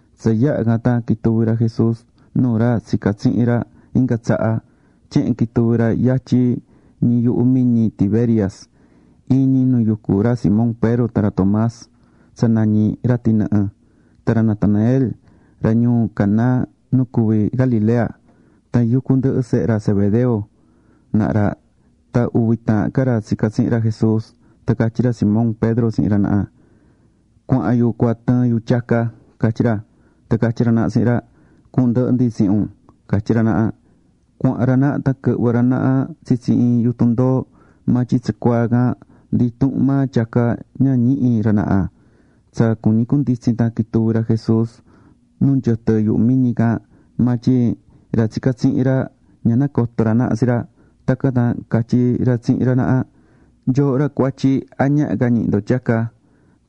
Tsa yaha̱ can tan quituvi̱ ra Jesús nuu ra tsica̱ tsihin ra inga tsaha. Tyehen quituvi̱ ra yatyin ñi yuhu miñi Tiberias: Iin ñi nu yucú ra Simón Pedro tan ra Tomás tsa nañí: “ra tɨnɨhɨ”, tan ra Natanael, ra ñuu Caná nu cuví Galilea. Tan yucú ndɨhɨ sehe ra Zebedeo naha ra tan uvi taahan ca ra tsica̱ tsihin ra Jesús. Tan catyí ra Simón Pedro tsihin ra naha: ―Cuahan yu cua tɨɨn yu tyaca ―catyí ra. Tan catyí ra naha tsihin ra: ―Cuhun ndɨhɨ ndi tsihin un ―catyí ra naha. Cuahán ra naha tan quɨhvɨ̱ ra naha tsitsi iin yutun ndoo, maa tyin tsacuaa can ndi intuhun maa tyaca ña ñihi̱ ra naha. Tsa cuñi cunditsin tan quituvi̱ ra Jesús nu nyɨtɨ yuhu miñi can. Maa tyin ra tsica̱ tsihin ra, ña nacoto̱ ra naha tsi ra. Tacan tan catyí ra tsihin ra naha: ―Nyooho ra cuatyi, ¿a ñaha ca ñihi ndo tyaca?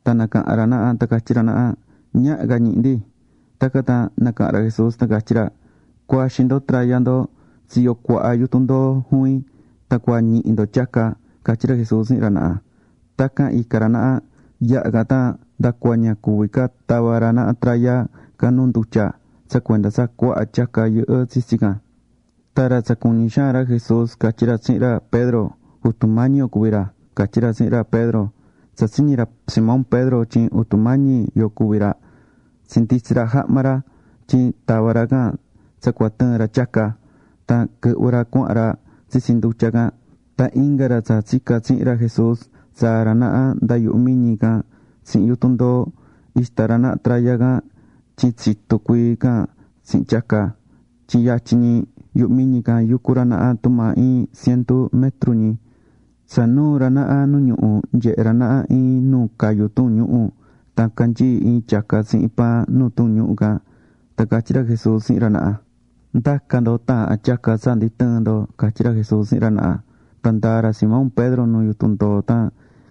Tan nacaha̱n ra naha tan catyí ra naha: ―Ñaha ca ñihi ndi. Tacan tan nacaha̱n ra Jesús tan catyí ra: ―Cu̱axin ndo traya ndo tsiyo cuaha yutun ndoo juvin, tan cua ñihi ndo tyaca ―catyí ra Jesús tsihin ra naha. Tacan ica̱ ra naha. Yaha can tan ndacua ña cuvi̱ ca tava ra naha traya can nu ndutya, tsa cuenda tsa cuaha tyaca yɨhɨ́ tsitsi can. Tan ra tsa cuñí xaan ra Jesús catyí ra tsihin ra Pedro: ―¡Jutu Mañi yo cuví ra! ―catyí ra tsihin ra Pedro. Tsa tsiñi̱ ra Simón Pedro tyin Jutu Mañi yo cuví ra, tsinditsi̱ ra jahma ra, tyin tava̱ ra can tsa cua tɨɨn ra tyaca, tan quɨhvɨ ra cuahán ra tsitsi ndutya can. Tan inga ra tsa tsica̱ tsihin ra Jesús tsaa̱ ra naha nda yuhu miñi can tsihin yutun ndoo, ixtá ra naha traya can tyin tsitu cuii can tsihin tyaca, tyin yatyin ñi yuhu miñi can yucu ra naha tumaa iin cientu metru ñi. Tsa nuu̱ ra naha nu ñuhu, nyehe̱ ra naha iin nu cayú tuun ñuhu̱. Tan canyií iin tyaca tsihin paan nuu tuun ñuhu̱ can. Tan catyí ra Jesús tsihin ra naha: ―Nda̱ca ndo taahan tyaca tsa ndi tɨɨ̱n ndo ―catyí ra Jesús tsihin ra naha. Tan ndaa̱ ra Simón Pedro nu yutun ndoo tan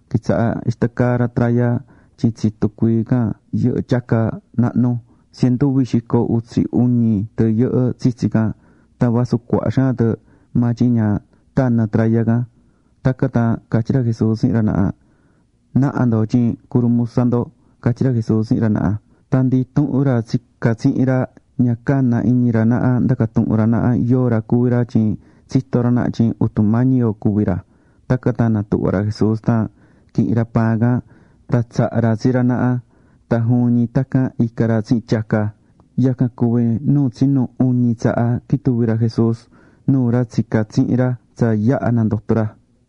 quitsaha̱ ixtá caa ra traya tyin tsitu cuii can yɨhɨ́ tyaca nahnu. Cientu uvi xico utsi uñi tɨ yɨhɨ́ tsitsi can. Tan vasu cuaha xaan tɨ, maa tyin ña tanɨ̱ traya can. Tacan tan catyí ra Jesús tsihin ra naha: ―Na̱ha ndo tyin curumusa ndo ―catyí ra Jesús tsihin ra naha. Tan ndi intuhun ra tsica̱ tsihin ra, ña cana̱ iñi ra naha ndaca tuhun ra naha yóo ra cuví ra tyin tsitó ra naha tyin Jutu Mañi yo cuví ra. Tacan tan natuhva̱ ra Jesús tan quihi̱n ra paan can, tan tsaha̱ ra tsi ra naha. Tan juvin ñi tacan ica̱ ra tsihin tyaca. Yacan cuví nu tsinu uñi tsaha quituvi̱ ra Jesús nuu ra tsica̱ tsihin ra tsa yaha̱ nandoto̱ ra.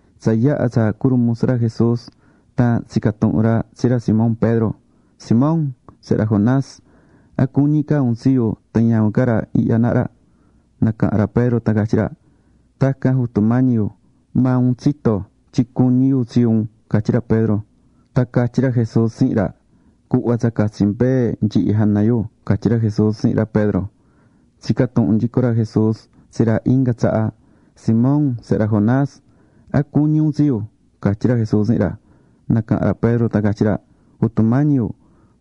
Tsa yaha̱ tsa curumusa ra Jesús, tan tsica̱ tuhun ra tsi ra Simón Pedro: ―Simón, sehe ra Jonás, ¿a cuñí ca un tsi yu tan ñavin ca ra ihya naha ra? Nacaha̱n ra Pedro tan catyí ra: ―Tacan Jutu Mañi yu, maa un tsitó tyin cuñí yu tsi un ―catyí ra Pedro. Tan catyí ra Jesús tsihin ra: ―Cu̱hva tsa catsi mbee nyihi jana yu ―catyí ra Jesús tsihin ra Pedro. Tsica̱ tuhun nyico ra Jesús tsi ra inga tsaha: ―Simón sehe ra Jonás, ¿a cuñí un tsi yu? ―catyí ra Jesús tsihin ra. Nacaha̱n ra Pedro tan catyí ra: ―Jutu Mañi yu,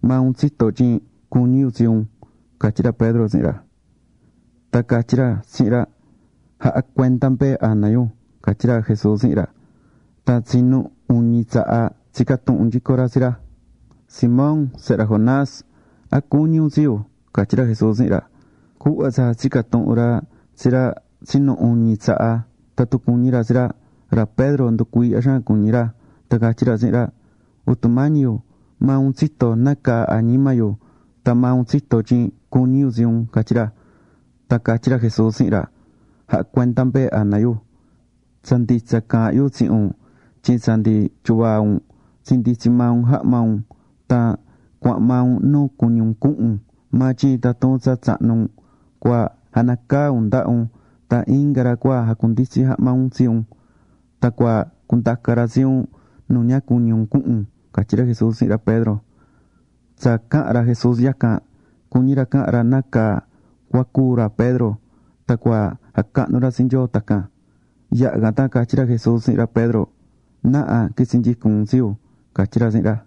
maa un tsitó tyin cuñí yu tsi un ―catyí ra Pedro tsihin ra. Tan catyí ra tsihin ra: ―Ja̱ha cuenda mbee jana yu ―catyí ra Jesús tsihin ra. Tan tsinu uñi tsaha tsica̱ tuhun nyico ra tsi ra: ―Simón, sehe ra Jonás, ¿a cuñí un tsi yu? ―catyí ra Jesús tsihin ra. Cuhva tsa tsica̱ tuhun ra tsi ra tsa tsinu uñi tsaha tatun cuñí ra tsi ra, ra Pedro nducuiihya xaan cuñí ra, tan catyí ra tsihin ra: ―Jutu Mañi yu, maa un tsitó nácaa añima yu tan maa un tsitó tyin cuñí yu tsi un ―catyí ra. Tan catyí ra Jesús tsihin ra: ―Ja̱ha cuenda mbee jana yu. Tsa nditsa caahán yu tsihin un tyin tsa ndi tyuvaa un tsinditsi̱ maa un jahma un tan cuahán maa un nu cuñí un cuhun un. Maa tyin tatun tsa tsahnu un, cua janacaa un ndaha un tan inga ra cua jacunditsi jahma un tsi un. Tan cua cundaca ra tsi un nu ña cuñí un cuhun un ―catyí ra Jesús tsihin ra Pedro. Tsa caha̱n ra Jesús yacan, cuñí ra cahan ra nácaa cua cúu ra Pedro tan cua jacahnu ra tsi Nyoo tacan. Yaha̱ can tan catyí ra Jesús tsihin ra Pedro: ―¡Na̱ha qu̱itsi nyicun un tsi yu! ―catyí ra tsihin ra.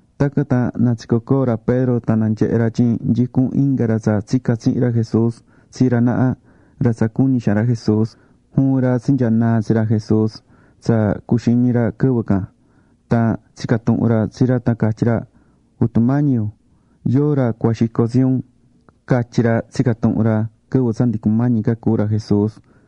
Tacan tan natsico̱ coo ra Pedro tan nyehe̱ ra tyin nyicún inga ra tsa tsica̱ tsihin ra Jesús tsi ra naha, ra tsa cuñí xaan ra Jesús. Juvin ra tsinyanaa̱ tsi ra Jesús tsa cuxiñi̱ ra quɨvɨ can. Tan tsica̱ tuhun ra tsi ra tan catyí ra: “Jutu Mañi yu, ¿yóo ra cua xico tsi un?” catyi̱ ra, tsica̱ tuhun ra quɨvɨ tsa ndi cumañi ca cúu ra Jesús.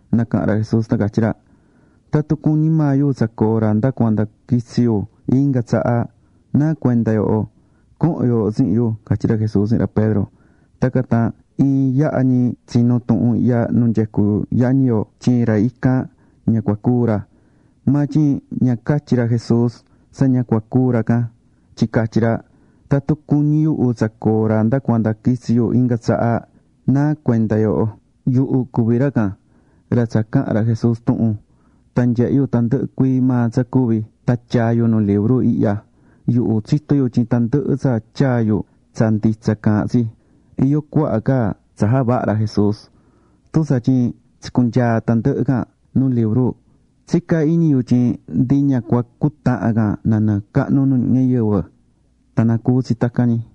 Nacaha̱n ra Jesús tan catyí ra: ―Tatun cuñí maa yu tsa coo ra nda cuanda quitsi yu inga tsaha, ¿náa cuenda yooho? Co̱hon yooho tsihin yu ―catyi ra Jesús tsihin ra Pedro. Tacan tan iin yaha ñi tsinu̱ tuhun ihya nu nyecú yañi yo tyin ra ican, ña cua cúu ra. Maa tyin ña catyi̱ ra Jesús tsa ña cua cúu ra can. Tyin catyí ra: “Tatun cuñí yuhu tsa coo ra nda cuanda quitsi yu inga tsaha, ¿náa cuenda yooho?” Yuhu cuví ra can, ra tsa caha̱n ra Jesús tuhun. Tan nyehe̱ yu tandɨhɨ cuii maa tsa cuvi̱ tan tyaa̱ yu nu libru ihya. Yuhu tsitó yu tyin tandɨhɨ tsa tyaa̱ yu, tsa nditsa caahán tsi. Iyó cuaha ca tsa javaha̱ ra Jesús. Tun tsatyin tsicunyaa̱ tandɨhɨ can nu libru, tsicá iñi yu tyin ndi ña cua cutahan can nanɨɨ cahnu nu ñuhu ñayɨvɨ. Tan na cuvi tsi tacan ñi.